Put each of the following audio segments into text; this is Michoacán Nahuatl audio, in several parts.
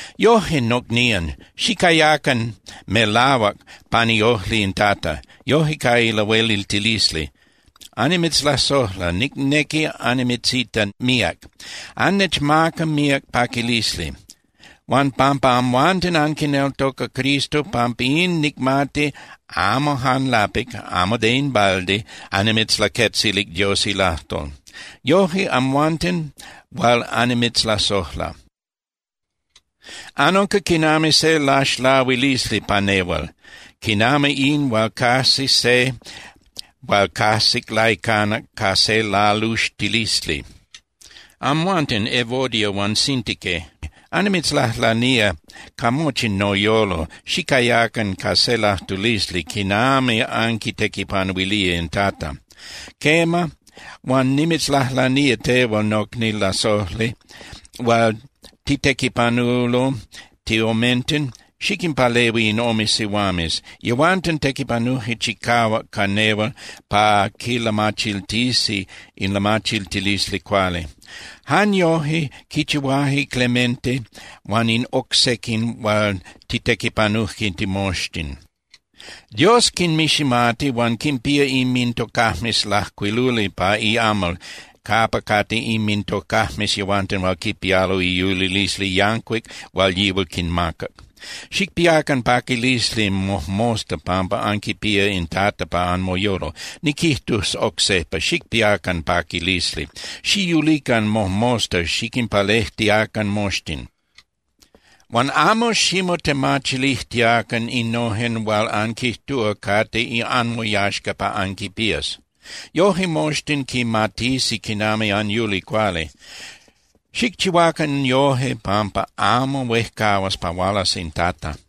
Yoje, nocnían, xicayacan melahuac pan iojli in Tata, yoje ca ilahueliltilisli. Annimitzlasojla, nicnequi annimitzita míac. Annechmaca míac paquilisli. Huan pampa amhuanten anquineltoca Cristo, pampa in nicmati amo jan lapic (amo de in balde) annimitzlaquetzilic Dios ilajtol. Yoje, amhuanten hual annimitzlasojla, anunca quinami se laxlahuilisli pa nehual, quinami in hual cajsi se hual cajsic laicanac ca se laluxtilisli. Amhuanten, Evodia huan Síntique, annimitzlajlanía ca mochi noyolo, xicayacan ca se lajtulisli quinami anquitequipanuilía in Tata. Quema, huan nimitzlajlanía tehual nocni lasojli hual titequipanulo tiomenten, xiquinpalehui in ome sihuames. Yehuanten tequipanuje chicahuac ca nehual pa quilamachiltisi in lamachiltilisli cuali. Jan yoje quichihuaje Clemente huan in oc sequin hual titequipanuje timoxtin. Dios quinmiximati huan quinpía inmintocajmes lajcuiluli pa iamal capa cate inmintocajmes yehuanten hual quipialo iyulilisli yancuic hual yihual quinmacac. Xicpiacan paquilisli mojmosta pampa anquipía in Tata pa anmoyolo. Niquijtus oc sejpa: ¡Xicpiacan paquilisli! Xiyulican mojmosta xiquinpalejtiacan moxtin. Huan amo ximotemachilijtiacan innojen hual anquijtúa cate anmoyaxca pa anquinpías. Yoje moxtin quimatisi quinami anyuli cuali. Xicchihuacan yoje pampa amo huejcahuas pa hualas in Tata.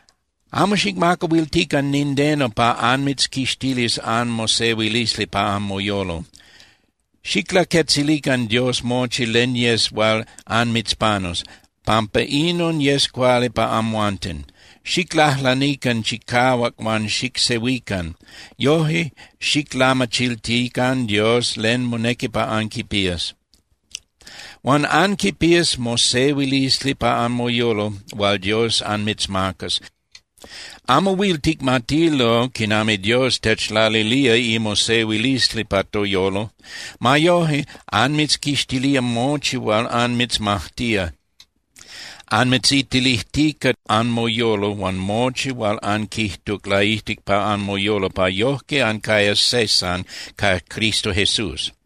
Amo xicmacahuiltican nindeno pa anmitzquixtilis anmosehuilisli pa anmoyolo. Xiclaquetzilican Dios mochi len yes hual anmitzpanus, pampa inon yes cuali pa amhuanten. Xiclajlanican chicahuac huan xicsehuican, yoje xiclamachiltican Dios len monequi pa anquipías. Huan anquipías mosehuilisli pa anmoyolo hual Dios anmitzmacas. Amo huil ticmatilo quinami Dios techlalilía imosehuilisli pa toyolo. Ma yoje, anmitzquixtilía mochi hual anmitzmajtía, anmitzitilijtica anmoyolo huan mochi hual anquijtuc laijtic pa anmoyolo pa yojque ancayas se san ca Cristo Jesús.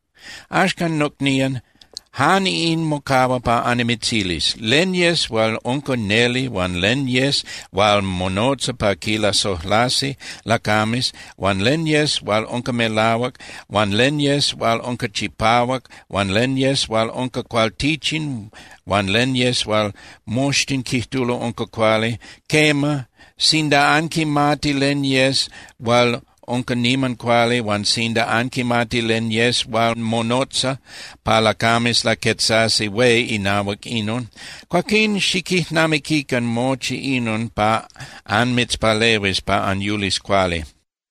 Axcan nocnían, jan in mocahua pa annimitzilis: Len yes hual unca neli huan len yes hual monotza pa quilasojlasi lacames huan len yes hual unca melahuac, huan len yes hual unca chipahuac, huan len yes hual unca cualtichin huan len yes hual moxtin quijtulo unca cuali, quema, sinda anquimati len yes hual unca niman cuali huan sinda anquimati len yes hual monotza pa lacames laquetzasi hué inahuac inon, cuaquín xiquijnamiquican mochi inon pa anmitzpalehuis pa anyulis cuali.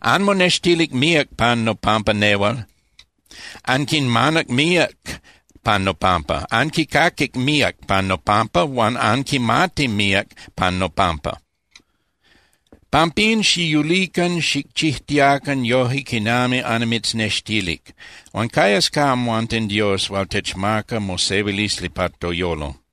Anmonextilic míac pan nopampa nehual, anquinmanac míac pan nopampa, anquicaquic míac pan nopampa huan anquimati míac pan nopampa. Pampín, xiyulican xicchijtiacan yoje quinami annimitznextilic. Huan cayas ca amhuanten Dios hual techmaca mosehuilisli pa toyolo.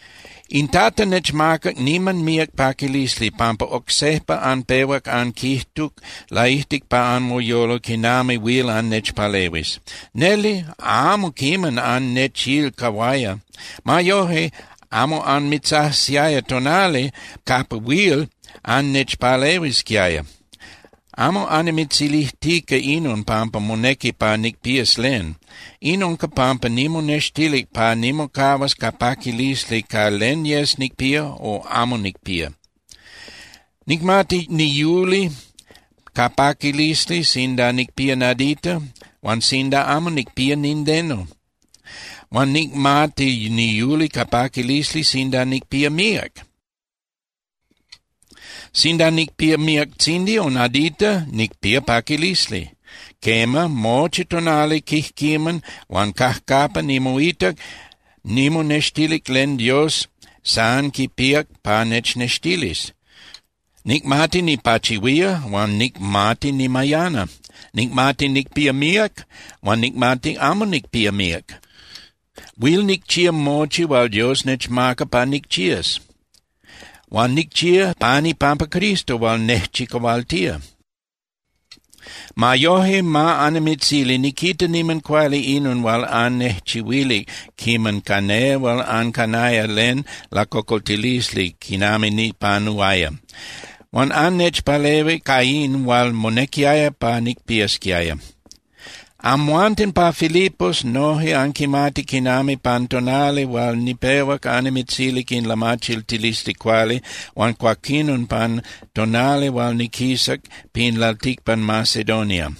In Tata nechmacac niman míac paquilisli pampa oc sejpa anpehuac anquijtuc laijtic pa anmoyolo quinami huil annechpalehuis. Neli, amo quiman annechilcahuaya. Ma yoje, amo anmitzajsiaya tonali capa huil annechpalehuisquiaya. Amo annimitzilijtica inon pampa monequi pa nicpías len. In unca pampa nimonextilic pa nimocahuas ca paquilisli ca len yes nicpía o amo nicpía. Nicmati niyuli ca paquilisli, sinda nicpía nadita, huan sinda amo nicpía nindeno. Huan nicmati niyuli ca paquilisli sinda nicpía míac. Sinda nicpía miactzindi o nadita, nicpía paquilisli. Quema, mochi tonali quijquiman huan cajcapa nimoitac, nimonextilic len Dios san quipíac pa nechnextilis. Nicmati nipachihuía huan nicmati nimayana. Nicmati nicpía míac huan nicmati amo nicpía míac. Huil nicchía mochi hual Dios nechmaca pa nicchías, huan nicchía pan ipampa Cristo hual nejchicahualtía. Ma yoje, ma annimitzili niquita niman cuali inon hual annejchihuilic quiman ca nehual ancanaya len lacocoltilisli quinami nipanuaya. Huan annechpalehuic ca in hual monequiaya pa nicpiasquiaya. Amhuanten pa Filipos noje anquimati quinami pan tonali hual nipehuac annimitzilic in lamachiltilisli cuali huan cuaquinon pan tonali hual niquisac pin lalticpan Macedonia,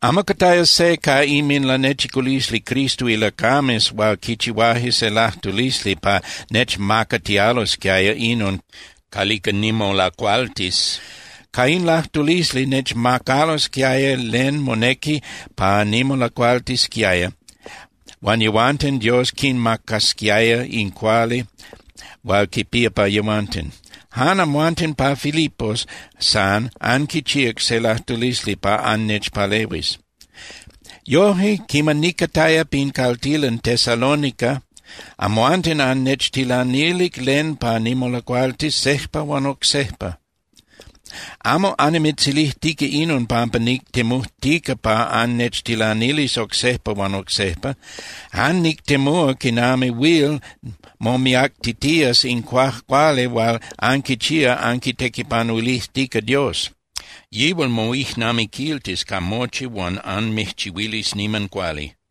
amo cataya se ca inminlanechiculisli Cristo ilacames hual quichihuaje se lajtulisli pa nechmacatialosquiaya inon calica nimolacualtis. Ca in lajtulisli, nechmacalosquiaya len monequi pa nimolacualtisquiaya huan yehuanten Dios quinmacasquiaya in cuali hual quipía pa yehuanten. Jan amhuanten pa Filipos san anquichíac se lajtulisli pa annechpalehuis. Yoje, quiman nicataya pin caltilan Tesalónica, amhuanten annechtilanilic len pa nimolacualtis sejpa huan oc sejpa. Amo annimitzilijtica inon pampa nictemujtica pa annechtilanilis oc sejpa huan oc sejpa. Jan nictemúa quinami huil momiactitías in cuajcuali hual anquichía anquitequipanuilijtica Dios. Yihual moijnamiquiltis ca mochi huan anmijchihuilis niman cuali.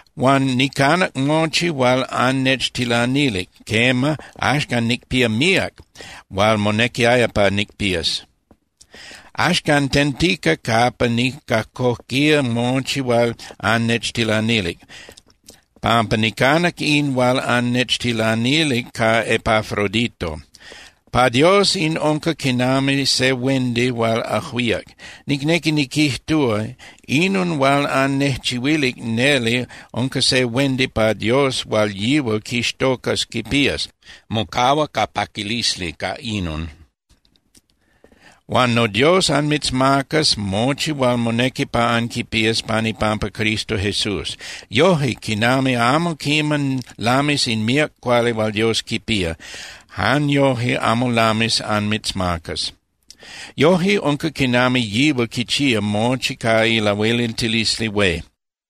Huan nicanac mochi hual annechtilanilic, quema, axcan nicpía míac hual monequiaya pa nicpías. Axcan tentica capa nicajcoquía mochi hual annechtilanilic, pampa nicanac in hual annechtilanilic ca Epafrodito. Pa Dios in unca quinami se huendi hual ajuíac. Nicnequi niquijtúa, inon hual annejchihuilic neli unca se huendi pa Dios hual yihual quixtocas quipías, mocahua ca paquilisli ca inon. Huan noDios anmitzmacas mochi hual monequi pa anquipías pan ipampa Cristo Jesús. Yoje, quinami amo quiman lamis in míac cuali hual Dios quipía, jan yoje amo lamis anmitzmacas. Yoje unca quinami yihual quichía mochi ca ilahueliltilisli hué.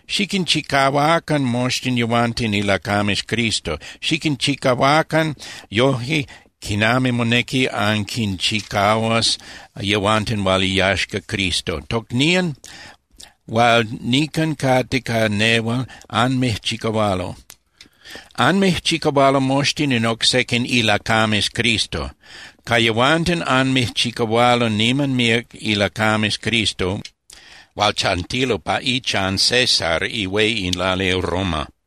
Xiquinchicahuacan moxtin yehuanten ilacames Cristo. Xiquinchicahuacan yoje quinami monequi anquinchicahuas yehuanten hual iyaxca Cristo. Tocnían hual nican cate ca nehual anmijchicahualo. Anmijchicahualo moxtin in oc sequin ilacames Cristo. Ca yehuanten anmijchicahualo niman míac ilacames Cristo hual chantilo pa ichan César ihué in lali Roma.